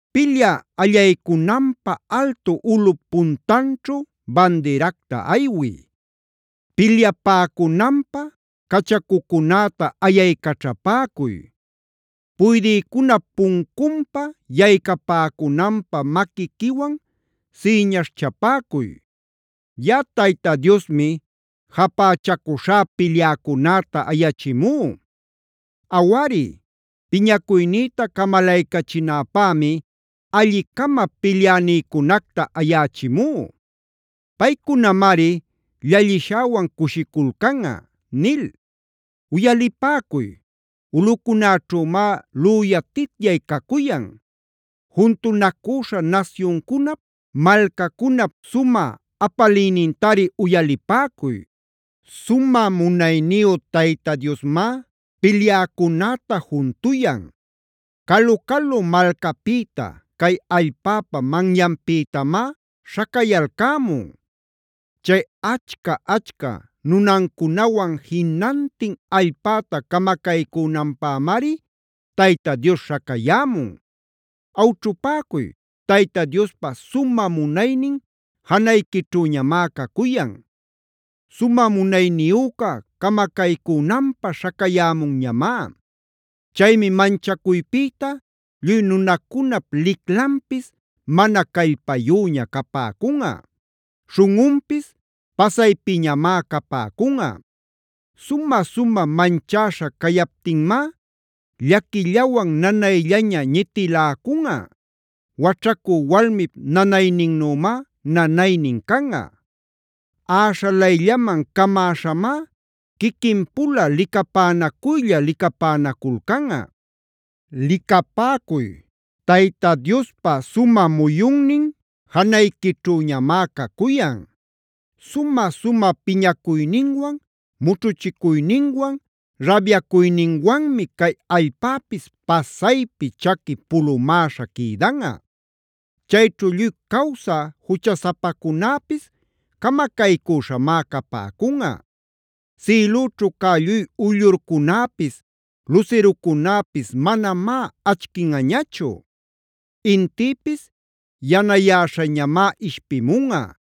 “Pilyä allaycunanpä altu ulꞌup puntanćhu bandiracta aywiy. Pilyapäcunanpäb cachacucunäta ayaycaćhapäcuy. Puydïcunap puncunpa yaycapäcunanpä maquiquiwan sïñaśhchapäcuy. Yaꞌa Tayta Diosmi japächacuśhá pilyäcunäta ayächimú. Awari, piñacuynïta camalaycachinäpämi alli-cama pilyänïcunacta ayächimú. Paycunamari llallishäwan cushiculcanꞌa” nil. Uyalipäcuy, ulꞌucunäćhümá lüyatityay cacuyan. Juntunacüśha nasyuncunap, malcacunap sumä apaliynintari uyalipäcuy. Sumä munayniyu Tayta Diosmá pilyäcunäta juntuyan. Calu-calu malcapïta, cay allpäpa manyanpïtamá śhacayalcämun. Chay achca-achca nunancunawan jinantin allpäta camacaycünanpämari Tayta Dios śhacayämun. ¡Awćhupäcuy! ¡Tayta Diospa sumä munaynin janayquićhüñamá cacuyan!c ¡Sumä munayniyüca camacaycünanpä śhacayämunñamá! Chaymi manchacuypïta lluy nunacunap liclanpis mana callpayüña capäcunꞌa; śhunꞌunpis pasaypiñamá capäcunꞌa. Sumä-sumä manchäśha cayaptinmá llaquillawan nanayllaña ñitiläcunꞌa. Waćhacü walmip nanayninnümá nanaynin canꞌa. Äśhalayllaman camäśhamá quiquinpula licapänacuylla licapänaculcanꞌa. Licapäcuy, Tayta Diospa sumä muyunnin janayquićhüñamá cacuyan. Sumä-sumä piñacuyninwan, mućhuchicuyninwan, rabayacuyninwanmi cay allpäpis pasaypi chaqui pulumäśha quïdanꞌa. Chayćhu lluy cawsä juchasapacunäpis camacaycüśhamá capäcunꞌa. Sïlućhu cä lluy uyllurcunäpis, lusirucunäpis manamá achquinꞌañachu. Intïpis yanayäśhañamá ishpimunꞌa;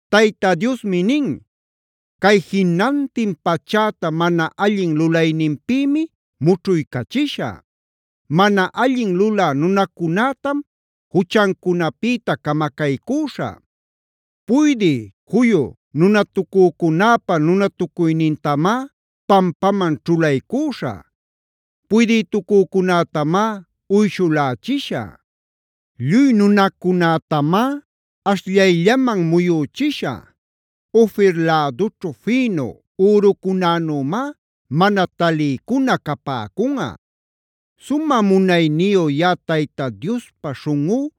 Tayta Diosmi nin: “Cay jinantin pachäta mana allin lulayninpïmi mućhuycachishä; mana allin lulä nunacunätam juchancunapïta camacaycüśhä. Puydï juyu nunatacücunäpa nunatucuynintamá, pampaman ćhulaycüśhä. Puydïtucücunätamá uyshulächishä. Lluy nunacunätamá ashllayllaman muyüchishä; Ofir lädućhu fïnu ürucunänümá mana taliycuna capäcunꞌa. Sumä munayniyu yaꞌa Tayta Diospa śhunꞌú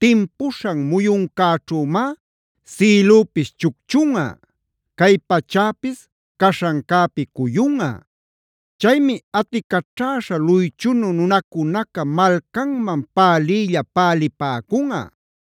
timpuśhan muyuncäćhümá sïlüpis chucchunꞌa, cay pachäpis caśhancäpi cuyunꞌa. “Chaymi aticaćhäśha luychunu nunacunaca malcanman päliylla pälipäcunꞌa;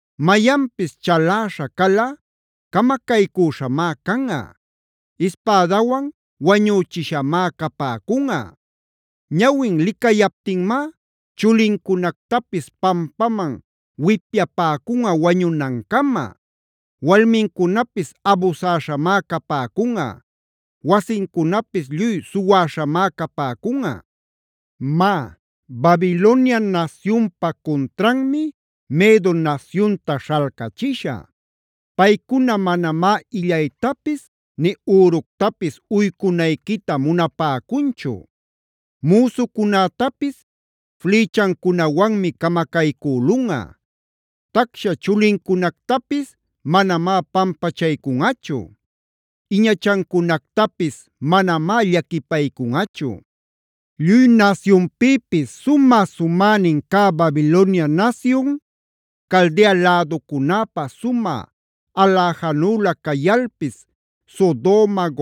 Mayanpis chaläśha calꞌa camacaycüśhamá canꞌa: ispädawan wañüchishamá capäcunꞌa. Ñawin licayaptinmá chulincunactapis pampaman wipyapäcunꞌa wañunancama; walmincunapis abusäśhamá capäcunꞌa, wasincunapis lluy suwäśhamá capäcunꞌa. “Má, Babilonia nasyunpa cuntranmi Medo nasyunta śhalcachishä. Paycuna manamá illaytapis nï üructapis uycunayquita munapäcunchu. Müsucunätapis flïchancunawanmi camacaycülunꞌa; tacsha chulincunactapis manamá pampachaycunꞌachu; iñachancunactapis manamá llaquipaycunꞌachu. “Lluy nasyunpïpis sumä-sumänin cä Babilonia nasyun, Caldea läducunäpa sumä aläjanüla cayalpis Sodoma,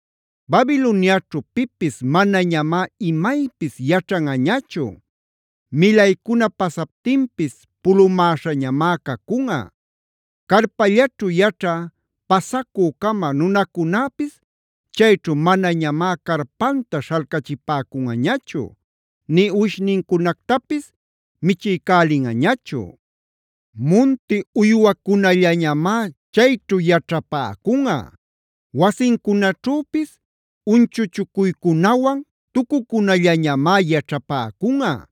Babiloniaćhu pipis manañamá imaypis yaćhanꞌañachu;g milaycuna pasaptinpis pulumäśhañamá cacunꞌa. Carpallaćhu yaćhä pasacü-cama nunacunäpis chayćhu manañamá carpanta śhalcachipäcunꞌañachu, nï uwishnincunactapis michiycälinꞌañachu. “Munti uywacunallañamá chayćhu yaćhapäcunꞌa. Wasincunaćhüpis unchuchucuycunawan tucucunallañamá yaćhapäcunꞌa;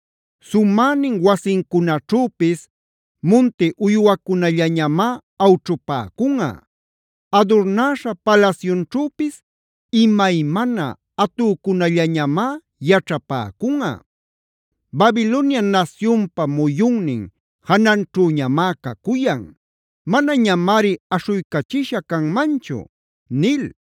Sumänin wasincunaćhüpis munti uywacunallamá awćhupäcunꞌa. Adurnäśha palasyunćhüpis imaymana atücunallañamá yaćhapäcunꞌa. Babilonia nasyunpa muyunnin jananćhüñamá cacuyan; manañamari aśhuycachisha canmanchu” nil.